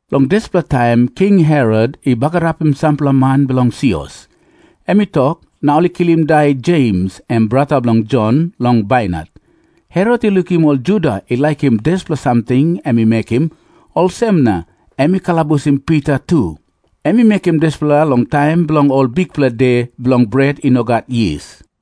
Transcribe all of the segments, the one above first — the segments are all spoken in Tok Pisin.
Long dispela taim King Herot i bagarapim sampela man bilong sios. Em i tok, na ol i kilim i dai Jems, em brata bilong Jon, long bainat. Herot i lukim ol Juda i laikim dispela samting em i mekim, olsem na em i kalabusim Pita tu. Em i mekim dispela long taim bilong Ol Bikpela De Bilong Bret I No Gat Yis.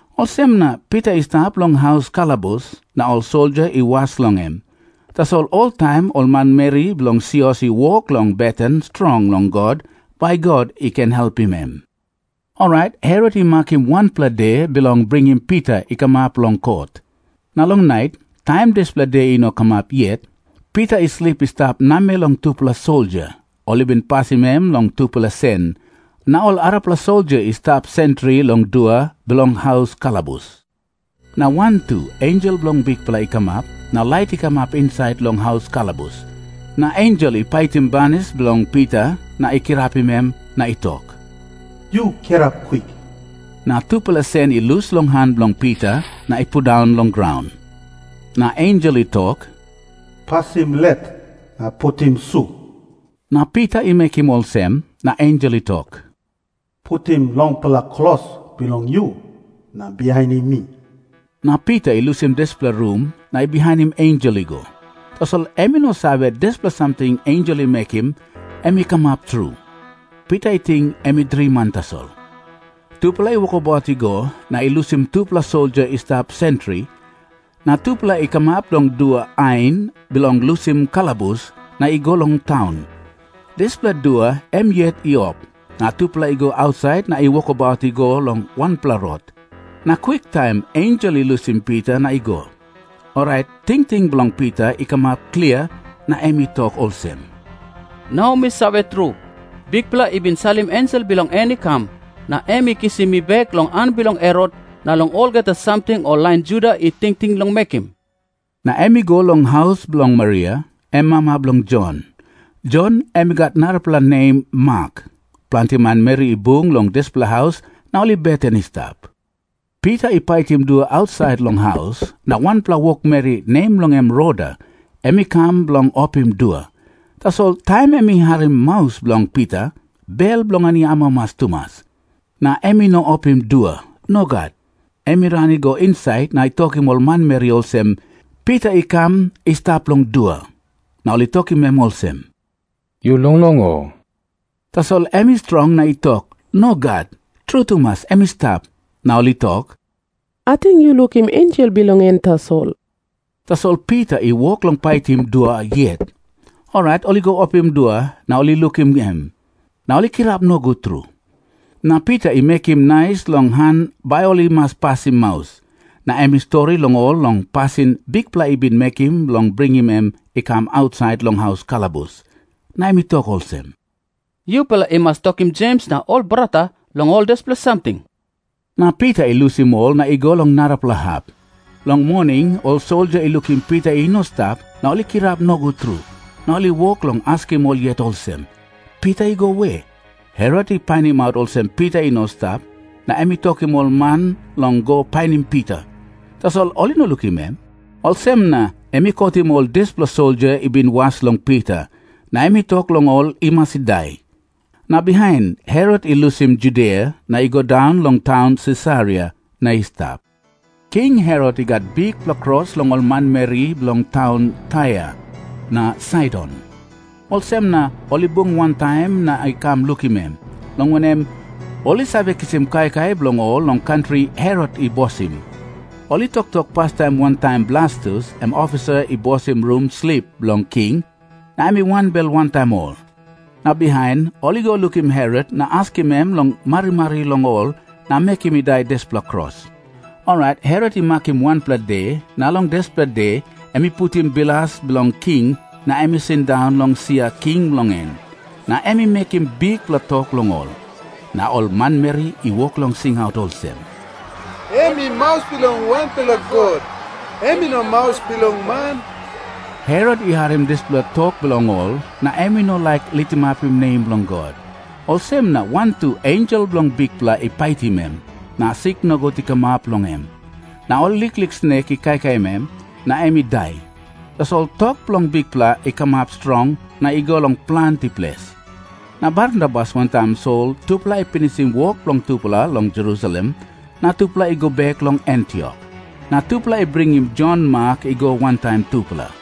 Olsem na Pita i stap long haus kalabus, na ol soldia i was long em. Tasol oltaim ol manmeri bilong sios i wok long beten strong long God, bai God i ken helpim em. Orait Herot i makim wanpela de bilong bringim Pita i kamap long kot. Na long nait, taim dispela de i no kamap yet, Pita i slip i stap namel long tupela soldia. Ol i bin pasim em long tupela sen. Na ol arapela soldia i stap sentri long dua bilong haus kalabus. Na wantu ensel bilong Bikpela i kamap, na lait i kamap insait long haus kalabus. Na ensel i paitim banis bilong Pita na i kirapim em, na i tok, “Yu kirap kwik.” Na tupela sen i lus long han bilong Pita na i pundaun long graun. Na ensel i tok, “Pasim let na putim su,” na Pita i mekim olsem. Na ensel i tok, “Putim longpela klos bilong yu na bihainim mi.” Na Pita i lusim dispela rum na i bihainim ensel i go. Tasol em i no save, dispela samting ensel i mekim em i kamap tru. Pita i ting em i driman tasol. Tupela i wokabaut i go na i lusim tupela soldia i stap sentri, na tupela i kamap long dua ain bilong lusim kalabus na i go long taun. Dispela dua em yet i op, na tupela i go ausait na i wokabaut i go long wanpela rot. Na kwiktaim ensel i lusim Pita na i go. Orait tingting bilong Pita i kamap klia, na em i tok olsem, “Nau mi save tru, Bikpela i bin salim ensel bilong en i kam, na em i kisim mi bek long han bilong Herot na long olgeta samting ol lain Juda i tingting long mekim.” Na em i go long haus bilong Maria, em mama bilong Jon. Jon em i gat narapela nem Mak. Planti manmeri i bung long dispela haus na ol i beten i stap. Pita i paitim dua ausait long haus, na wanpela wokmeri, nem bilong en Roda, em i kam bilong opim dua. Tasol taim em i harim maus bilong Pita, bel bilong en i amamas tumas, na em i no opim dua. Nogat. Em i ran i go insait na i tokim ol manmeri olsem, “Pita i kam i stap long dua!” Na ol i tokim em olsem, “Yu longlong, o?” Tasol em i strong na i tok, “Nogat. Tru tumas em i stap.” Na ol i tok, “Ating yu lukim ensel bilong en tasol.” Tasol Pita i wok long paitim dua yet. Orait ol i go opim dua na ol i lukim em, na ol i kirap nogut tru. Na Pita i mekim nais long han bai ol i mas pasim maus. Na em i stori long ol long pasin Bikpela i bin mekim bilong bringim em i kam ausait long haus kalabus. Na em i tok olsem, “Yupela i mas tokim Jems na ol brata long ol dispela samting.” Na Pita i lusim ol na i go long narapela hap. Long moning ol soldia i lukim Pita i no i stap na ol i kirap nogut tru, na ol i wok long askim ol yet olsem, “Pita i go we?” Herot i painimaut olsem Pita i no i stap, na em i tokim ol man long go painim Pita, tasol ol i no lukim em. Olsem na em i kotim ol dispela soldia i bin was long Pita, na em i tok long ol i mas i dai. Na bihain, Herot i lusim Judia na i go daun long taun Sisaria na i stap. King Herot i gat bikpela kros long ol manmeri bilong taun Tair na Saidon. Olsem na ol i bung wantaim na i kam lukim em, long wanem, ol i save kisim kaikai bilong ol long kantri Herot i bosim. Ol i toktok pastaim wantaim Blastus, em ofisa i bosim rum slip bilong king, na em i wanbel wantaim ol. Na bihain, ol i go lukim Herot na askim em long marimari long ol na mekim i dai dispela kros. Orait Herot i makim wanpela de, na long dispela de em i putim bilas bilong king, na em i sindaun long sia king bilong en, na em i mekim bikpela tok long ol. Na ol manmeri i wok long singaut olsem, “Em i maus bilong wanpela god. Em i no maus bilong man.” Herot i harim dispela tok bilong ol, na em i no laik litimapim nem bilong God, olsem na wantu ensel bilong Bikpela i paitim em. Na sik nogut i kamap long en, na ol liklik snek i kaikai em, na em i dai. Tasol tok bilong Bikpela i kamap strong na i go long planti ples. Na Barnabas wantaim Sol tupela i pinisim wok bilong tupela long Jerusalem, na tupela i go bek long Antiok. Na tupela i bringim Jon Mak i go wantaim tupela.